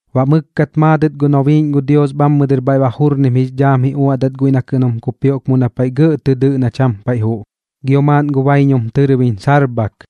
Baꞌ mɨkkat maadɨt gu nobiiꞌñ gu Dios bhammɨ dɨr bhaiꞌ ba jurnim jix dhaam ji uaꞌdat guiꞌ na kɨꞌn jum kupioꞌk mu na paiꞌ gɇꞌ tɨ dɨꞌ na cham paiꞌ juꞌ gio maaꞌn gu baiñum tɨrbiñ sarbhak.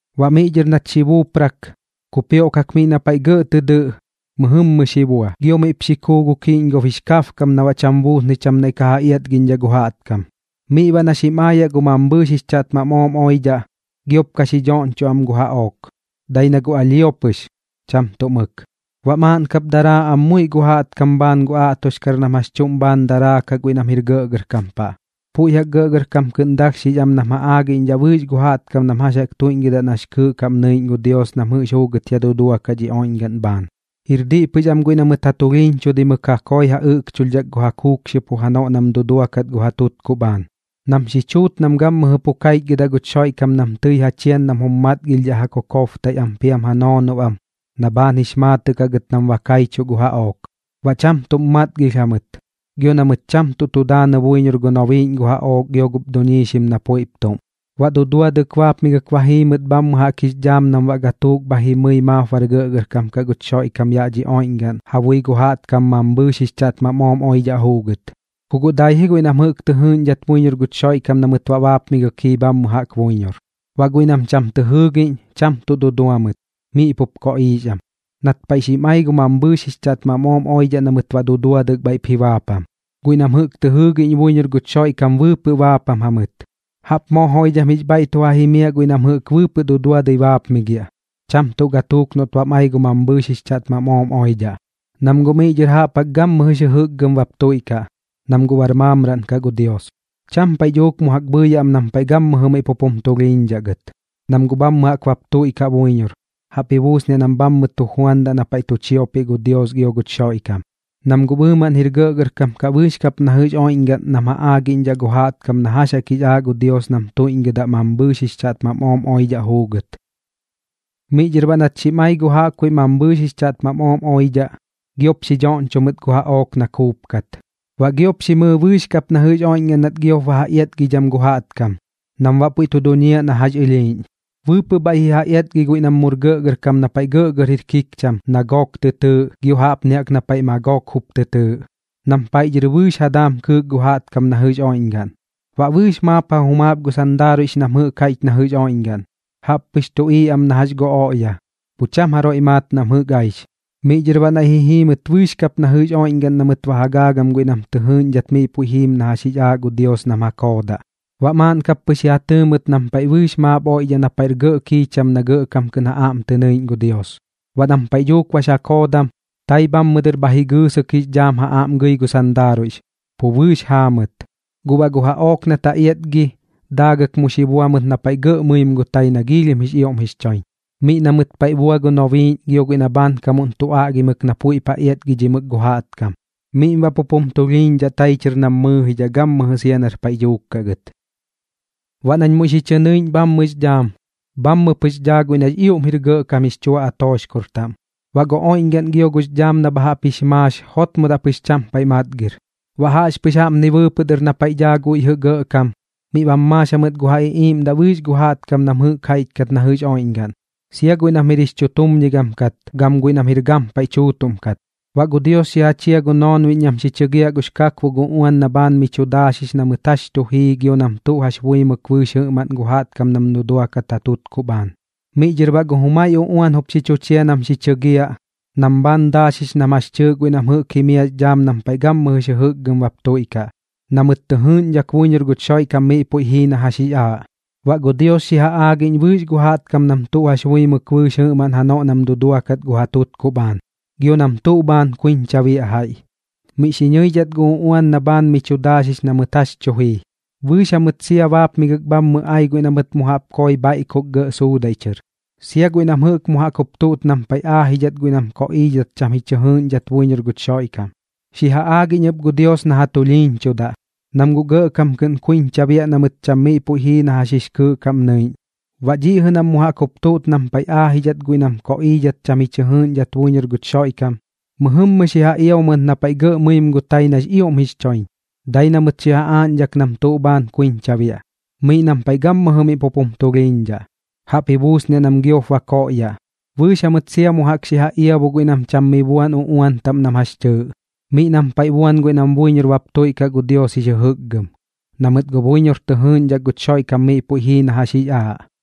Baꞌ miꞌ dhɨr nat xi buuprak, kupioꞌkak miꞌ na paiꞌ gɇꞌ tɨ dɨꞌ mɨjɨmmɨ xi bua, gio miꞌp xi kuu gu kiꞌñgob jix kabkam na baꞌ cham buusnɨi cham naiꞌ ka ja iatgiꞌñdhaꞌ gu jaꞌtkam. Miꞌ baꞌ na xim aayaꞌ gu mambhɨɨx jix chaꞌtmam ooꞌm oidhaꞌ, giop ka xi dhoꞌñchoꞌ am gu jaꞌook, dai na guꞌ alhio pɨx, cham tuꞌ mɨk. Baꞌ maaꞌn kap daraa am muiꞌ gu jaꞌtkam bhaan gu aꞌtoxkar nam jax chuꞌm bhaan daraakaꞌ guiꞌ nam jir gɇꞌgɇrkam paꞌ. Puiꞌ jaꞌk gɇꞌgɇrkam kɨꞌn dalhxix am nam ja aagiꞌñdhaꞌ bɨɨx gu jaꞌtkam nam jax jaꞌk tuiꞌñgɨdaꞌ nax kɨɨꞌ kaꞌm nɨiꞌñ gu Dios nam jɨꞌx juugɨt ya duduakaꞌ dhi oiꞌñgaꞌn bhaan. Jir diꞌ pɨx am guiꞌ na mɨt ja tulhiiñchudaimɨk ja koi ja ɨꞌkchulhdhak gu ja kuukxiopo janoꞌ nam duduakat gu ja tutkuꞌ bhaan, nam xi chuut nam gammɨjɨ pu kaichgɨdaꞌ guch Xoiꞌkam nam tɨi ja chian nam jum matgilhdhaꞌ ja kokobtaiꞌ am piam ja noonob am na bhaan jix maatɨꞌ kaꞌ gɨt nam kaichuꞌ gu jaꞌook. Baꞌ cham tuꞌm matgilh jamɨt, gio na mɨt cham tuꞌ tu daanɨ buiñor gu nobiiꞌñ gu jaꞌook gio gup duiñxim na puiꞌp tuꞌm. Baꞌ duduadɨk baapmigɨk ba jii mɨt bhammɨ jaꞌk jix dhaam nam baꞌ gatuuk gio bhaiꞌp jimɨi maap bar gɇꞌgɇrkam kaꞌ guch Xoiꞌkam yaꞌ dhi oiꞌñgaꞌn ja bui gu jaꞌtkam mambhɨɨx jix chaꞌtmam ooꞌm oidhaꞌ juugɨt. Ku guꞌ dai guiꞌ ji nam jɨꞌk tɨ jɨɨꞌñdhat buiñor guch Xoiꞌkam na mɨt baꞌ baapmigɨk jii bhammɨ jaꞌk buiñor. Baꞌ guiꞌ nam cham tɨ jɨɨgiꞌñ, cham tuꞌ dudua mɨt, miꞌ pup koꞌiix am, nat paiꞌ xim ai gu mambhɨɨx jix chaꞌtmam ooꞌm oidhaꞌ na mɨt baꞌ duduadɨk bhaiꞌp ji baapam. Guiꞌ nam jɨꞌk tɨ jɨɨgiꞌñ buiñor guch Xoiꞌkam, bɨɨpɨꞌ baapam jamɨt. ¡Jaꞌp moo joidham jix bhaiꞌ tu ja jimiaꞌ guiꞌ nam jɨꞌk bɨɨpɨꞌ duduadɨi baapmigiaꞌ, cham tuꞌ gatuuk noꞌt bam ai gu mambhɨɨx jix chaꞌtmam ooꞌm oidhaꞌ! Nam guꞌ miꞌ dhɨr jaꞌp jaꞌk gammɨjɨx jɨjɨkgɨm bap tuiꞌkaꞌ, nam guꞌ bar maamraꞌn kaꞌ gu Dios. Cham paiꞌ dhuuk mu jaꞌk bhɨɨyaꞌ am nam paiꞌ gammɨjɨ miꞌ pup jum tulhiiñdhaꞌ gɨt, nam guꞌ bhammɨ jaꞌk bap tuiꞌkaꞌ buiñor, jaꞌp ji buusniaꞌ nam bhammɨ tu juandaꞌ na paiꞌ tu chiopiꞌ gu Dios gio guch Xoiꞌkam, nam guꞌ bɨɨmaꞌn jir gɇꞌgɇrkam kaꞌ bɨɨx kap na jɨꞌx oiꞌñgaꞌn nam ja aagiꞌñdhaꞌ gu jaiꞌ jaꞌtkam na jax jaꞌk jix aaꞌ gu Dios nam tuiꞌñgɨdaꞌ mambhɨɨx jix chaꞌtmam ooꞌm oidhaꞌ juugɨt. Miꞌ dhɨr baꞌ nat xim ai gu jaꞌkbuiꞌ mambhɨɨx jix chaꞌtmam ooꞌm oidhaꞌ, giop xi dhoꞌñcho mɨt gu jaꞌook na kuupkat. Baꞌ giop xi mɨɨ bɨɨx kap na jɨꞌx oiꞌñgaꞌn nat giop ba ja iatgidham gu jaꞌtkam nam baꞌ puiꞌ tu duñiaꞌ na jax ɨlhiiꞌñ. Bɨɨpɨꞌ bhaiꞌ ji ja iatgi guiꞌ nam mur gɇꞌgɇrkam na paiꞌ gɇꞌgɇr jir kikcham na Goog tɨ tɨɨꞌ, gio jaꞌpni jaꞌk na paiꞌ Magoog jup tɨ tɨɨꞌ, nam paiꞌ dhɨr bɨɨx ja daam kɨɨk gu jaꞌtkam na jɨꞌx oiꞌñgaꞌn. Baꞌ bɨɨx maap ja jumaap gu sandaaruiꞌx nam jɨꞌk jaiꞌch na jɨꞌx oiꞌñgaꞌn, jaꞌp pɨx tuꞌiiꞌ am na jax gu oꞌya, pu cham jaroiꞌ maat nam jɨꞌk aix. Miꞌ dhɨr baꞌ naiꞌ ji jii mɨt bɨɨx kap na jɨꞌx oiꞌñgaꞌn na mɨt ba ja gaagam guiꞌ nam tɨ jɨɨꞌñdhat miꞌ puiꞌ jiim na jax jix aaꞌ gu Dios nam ja koodaꞌ. Baꞌ maaꞌn kap pɨx ji ja tɨɨ mɨt nam bɨɨx maap oiꞌdhaꞌ na paiꞌ gɇꞌr kiicham na gɇꞌkam kɨꞌn ja aꞌm tɨ nɨiꞌñ gu Dios. Baꞌ nam paiꞌ dhuuk bax ja koodam, tai bhammɨ dɨr bha jigɨɨsɨk jix dhaam ja aꞌm gɨi gu sandaaruiꞌx, pu bɨɨx jaa mɨt. Guꞌ baꞌ gu jaꞌook nat ja iatgi, daagɨk mu xi bua mɨt na paiꞌ gɇꞌ mɨim gu tai na giilhim jix ioꞌm jix choiñ, miꞌ na mɨt paiꞌ bua gu nobiiꞌñ gio guiꞌ na bhaankamuꞌn tu aꞌgimɨk na puiꞌp ja iatgidhimɨk gu jaꞌtkam. Miꞌm baꞌ pup jum tulhiiñdhaꞌ tai chɨr nam mɨɨjidhaꞌ gammɨjɨ sia na paiꞌ dhuuk kaꞌ gɨt. Baꞌ nañ muiꞌ xi chɨ nɨiꞌñ bhammɨx dhaam, bhammɨ pɨx dhaa guiꞌ nax ioꞌm jir gɇꞌkam jix chua atooxkor taꞌm. Baꞌ gu oiꞌñgaꞌn gio gux dhaam na bha jaꞌp jix maax jotmodaꞌ pɨx cham paiꞌ matgir. Baꞌ jaꞌxpɨx jaꞌpni bɨɨpɨꞌ dɨr na paiꞌ daa guiꞌ jɨꞌ gɇꞌkam, miꞌ bam maax jamɨt gu ja iꞌiiꞌmdaꞌ bɨɨx gu jaꞌtkam nam jɨꞌk jaiꞌch kat na jɨꞌx oiꞌñgaꞌn, sia guiꞌ nam jir jix chutumñigam kat gam guiꞌ nam jir gampaiꞌ tuutuꞌm kat. Baꞌ gu Dios xi ja chia gu noonbiꞌñ nam xi chɨgiaꞌ gux kakbok uꞌuan na bhaan mi chu daaxix na mɨt jax chu jii gio nam tuꞌ jax buimɨk bɨɨx jɨꞌmaꞌn gu jaꞌtkam nam duduakat gu ja tutkuꞌ bhaan. Miꞌ dhɨr baꞌ gu jumai uꞌuan jup xi chu chia nam xi chɨgiaꞌ nam bhaan daaxix nam jax chɨɨꞌ guiꞌ nam jɨꞌk jimiaꞌx dhaam nam paiꞌ gammɨjɨx jɨjɨkgɨm bap tuiꞌkaꞌ, na mɨt tɨ jɨɨꞌñdhak buiñor guch Xoiꞌkam miꞌ puiꞌ jii na jax jix aaꞌ. Baꞌ gu Dios xi ja aagiꞌñ bɨɨx gu jaꞌtkam nam tuꞌ jax buimɨk bɨɨx jɨꞌmaꞌn janoꞌ nam duduakat gu ja tutkuꞌ bhaan, gio nam tuꞌ bhaan kuiñcha biaꞌ jaiꞌ, miꞌ xi ñɨidhat gu uꞌuan na bhaan mi chu daaxix na mɨt jax chu jii. Bɨɨx jamɨt sia baapmigɨk bhammɨ ai guiꞌ na mɨt mu jaꞌp koi bhaiꞌkok gɇꞌ suudaiꞌ chɨr, sia guiꞌ nam jɨꞌk mu jaꞌk jup tuꞌt nam paiꞌ aajidhat guiꞌ nam koꞌiidhat cham ji chɨ jɨɨꞌñdhai buiñor guch Xoiꞌkam. Xi ja aagiꞌñ ɨp gu Dios na ja tulhiiñchudaꞌ, nam guꞌ gɇꞌkam kɨꞌn kuiñcha biaꞌ na mɨt guꞌ cham miꞌ puiꞌ jii na jax jix kɨɨꞌ kaꞌm nɨiꞌñ. Baꞌ dhiꞌ jɨꞌ nam mu jaꞌk jup tuꞌt nam paiꞌ jaꞌk aajidhat guiꞌ nam koꞌiidhat cham ji chɨ jɨɨꞌñdhai buiñor guch Xoiꞌkam, mɨjɨmmɨ xi ja iabu mɨt na paiꞌ gɇꞌ mɨim gu tai nax ioꞌm jix choiñ, dai na mɨt xi ja aaꞌñdhak nam tuꞌ bhaan kuiñcha biaꞌ, miꞌ nam paiꞌ gammɨjɨ miꞌ pup jum tulhiiñdhaꞌ, jaꞌp ji buusniaꞌ nam giop ba koꞌyaꞌ. Bɨɨx jamɨt sia mu jaꞌk xi ja iabu guiꞌ nam cham mi buan uꞌuan taꞌm nam jax chɨɨꞌ, miꞌ nam paiꞌ buan guiꞌ nam buiñor bap tuiꞌkaꞌ gu Dios jix jɨjɨkgɨm, na mɨt guꞌ buiñor tɨ jɨɨꞌñdhak guch Xoiꞌkam miꞌ puiꞌ jii na jax jix aaꞌ.